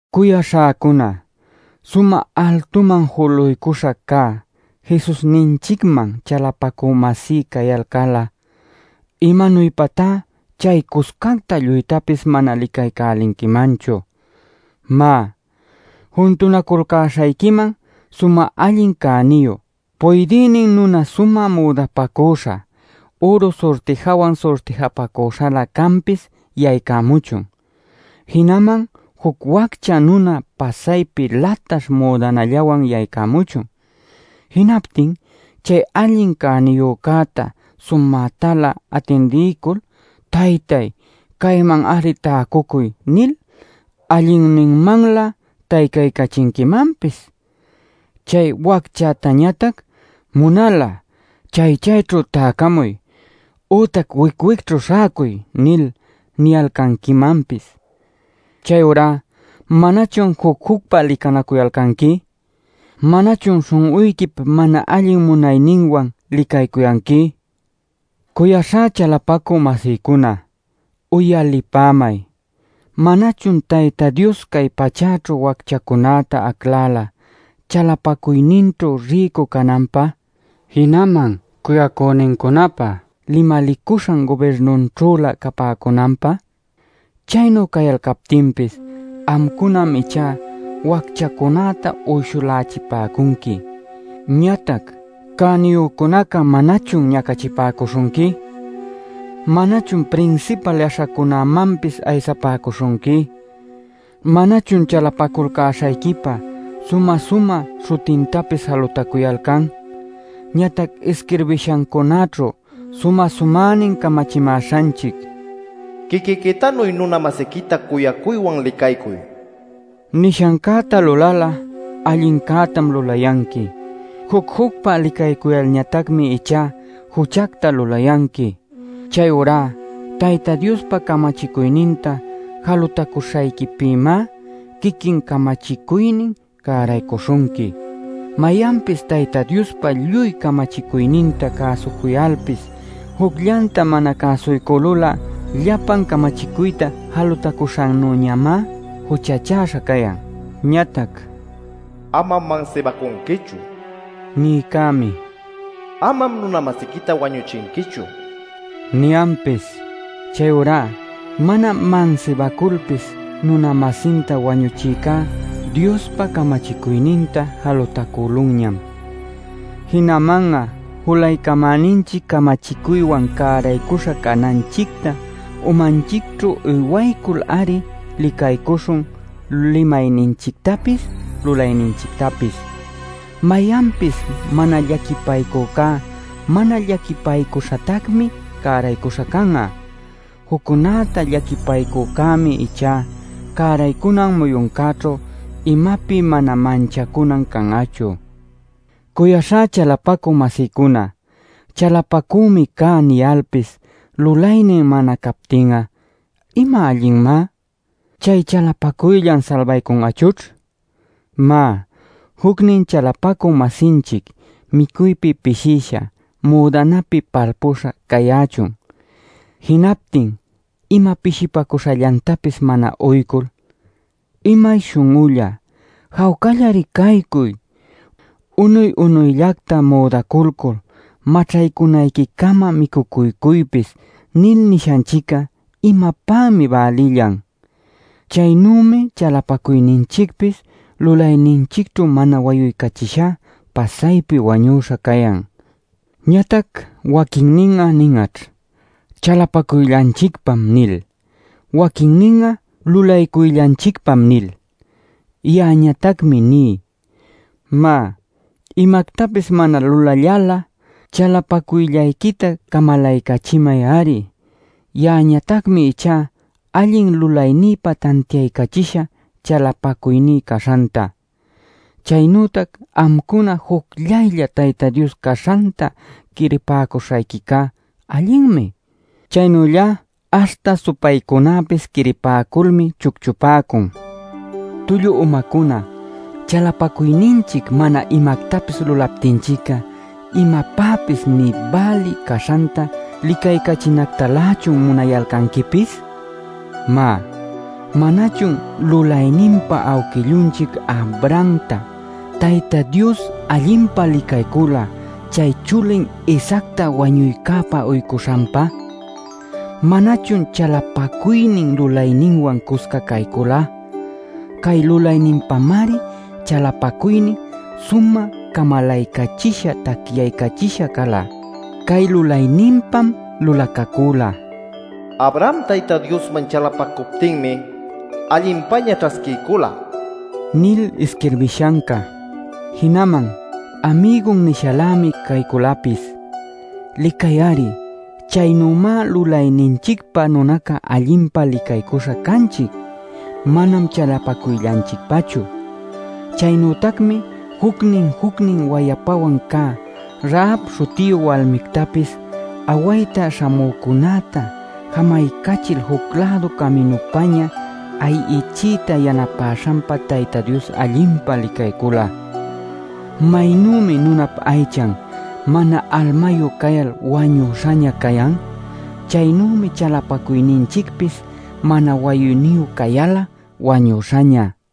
Cuyaśhäcuna, sumä altuman juluycuśha cä Jesusninchicman chalapacü-masí cayalcal'a ¿imanuypatá chaycuscacta lluytapis mana licaycälinquimanchu? Má, juntunaculcäśhayquiman sumä allin cäniyu puydïnin nuna sumä müdapacüśha, üru surtijawan surtijapacüśhalä canpis yaycamuchun. Jinaman juc waccha nuna pasaypi lataśh müdanallanwan yaycamuchun. Jinaptin chay allin cäniyücäta sumätalä atindiycul “Taytay, cayman-ari täcucuy” nil allinninmanlä taycaycachinquimanpis. Chay wacchätañatac “Munal'a chay chayćhu täcamuy, ütac wic wicćhu śhäcuy” nil niyalcanquimanpis. ¿Chayurá manachun juc-jucpa licanacuyalcanqui? ¿Manachun śhun'uyquip mana allin munayninwan licaycuyanqui? Cuyaśhá chalapacü-masïcuna, uyalipämay. ¿Manachun Tayta Dios cay pachäćhu wacchacunäta aclala chalapacuyninćhu rïcu cananpä, jinaman cuyacünincunapä limalicuśhan gubirnunćhülä capäcunanpä? Chaynu cayalcaptinpis amcunam ichá wacchacunäta uyshulächipäcunqui. Ñatac cäniyücunacá ¿manachun ñacachipäcuśhunqui? ¿Manachun prinsipal yaśhacunämanpis aysapäcuśhunqui? ¿Manachun chalapaculcäśhayquipa sumä-sumä śhutintapis jalutacuyalcan? Ñatac isquirbishancunaćhu sumä-sumänin camachimäśhanchic “Quiquiquitanuy nuna-masiquita cuyacuywan licaycuy” nishancäta lulal'a allincätam lulayanqui. Juc-jucpa licaycuyalñatacmi ichá juchacta lulayanqui. Chayurá Tayta Diospa camachicuyninta jalutacuśhayquipïmá quiquin camachicuynin cäraycuśhunqui. Mayanpis Tayta Diospa lluy camachicuyninta cäsucuyalpis jucllanta mana cäsuycülul'a llapan camachicuyta jalutacuśhannüñamá juchachäśha cayan. Ñatac “Amam mansibacunquichu” nïcämi “Amam nuna-masiquita wañuchinquichu” niyanpis. Chayurá mana mansibaculpis nuna-masinta wañuchïcá Diospa camachicuyninta jalutacülunñam. Jinaman'a julaycamäninchic camachicuywan cäraycuśha cananchicta umanchicćhu uywaycul-ari licacuycuśhun limayninchictapis lulayninchictapis. Mayanpis mana llaquipaycücá, mana llaquipaycuśhatacmi cäraycuśha can'a. Juccunäta llaquipaycücämi ichá cäraycunan muyuncäćhu imapi mana manchacunan can'achu. Cuyaśhá chalapacü-masïcuna, “chalapacümi cá” niyalpis lulaynin mana captin'a ¿ima allinmá? ¿Chay chalapacuyllan salbaycun'achućh? Má, jucnin chalapacü-masinchic micuypi pishïsha, müdanapi palpüśha cayächun. Jinaptin ima pishipacüśhallantapis mana uycul: “¡Imay śhun'ulla, jawcallari caycuy; unuy-unuyllacta müdaculcul maćhaycunayquicama micucuycuypis!” nil nishanchic'a ¿imapämi bälillan? Chaynümi chalapacuyninchicpis, lulayninchicćhu mana wayuycachishá pasaypi wañüśha cayan. Ñatac waquinnin nin'aćh: “chalapacuyllanchicpam” nil, waquinnin'a “lulaycuyllanchicpam” nil. Ya'añatacmi ní: ¡Má, imactapis mana lulallal'a chalapacuyllayquita camalaycachimay-ari! Ya'añatacmi ichá allin lulaynïpa tantiaycachishä chalapacuyní caśhanta. Chaynütac amcuna jucllaylla Tayta Dios caśhanta quiripäcuśhayquicá allinmi. Chaynüllá aśhta supaycunäpis quiripäculmi chucchupäcun. Tullu umacuna, chalapacuyninchic ¿mana imactapis lulaptinchic'a imapäpis nï bälï caśhanta licaycachinactalächun munayalcanquipis? Má, ¿manachun lulayninpa awquillunchic Abrahamta Tayta Dios allinpa licaycula chay chulin Isaacta wañuycäpä uycuśhanpa? ¿Manachun chalapacuynin lulayninwan cusca caycula? Cay lulayninpamari chalapacuynin sumä camalaycachisha tacyaycachisha cala. Cay lulayninpam lulacacüla: “Abraham Tayta Diosman chalapacuptinmi allinpäña ćhasquiycula” nil isquirbishanca. Jinaman “amigun” nishalämi cayculapis. Licay-ari, chaynümá lulayninchicpa nunaca allinpa licaycuśha canchic; manam chalapacuyllanchicpachu. Chaynütacmi jucnin jucnin wayapawan cä Rahab śhutiyu walmictapis awayta śhamücunäta jamaycachil juc-lädu caminupña ayichiyta yanapäśhanpa Tayta Dios allinpa licaycula. Maynümi nunap aychan mana almayu cayal wañüśhaña cayan, chaynümi chalapacuyninchicpis mana wayuyniyu cayal'a wañüśhaña.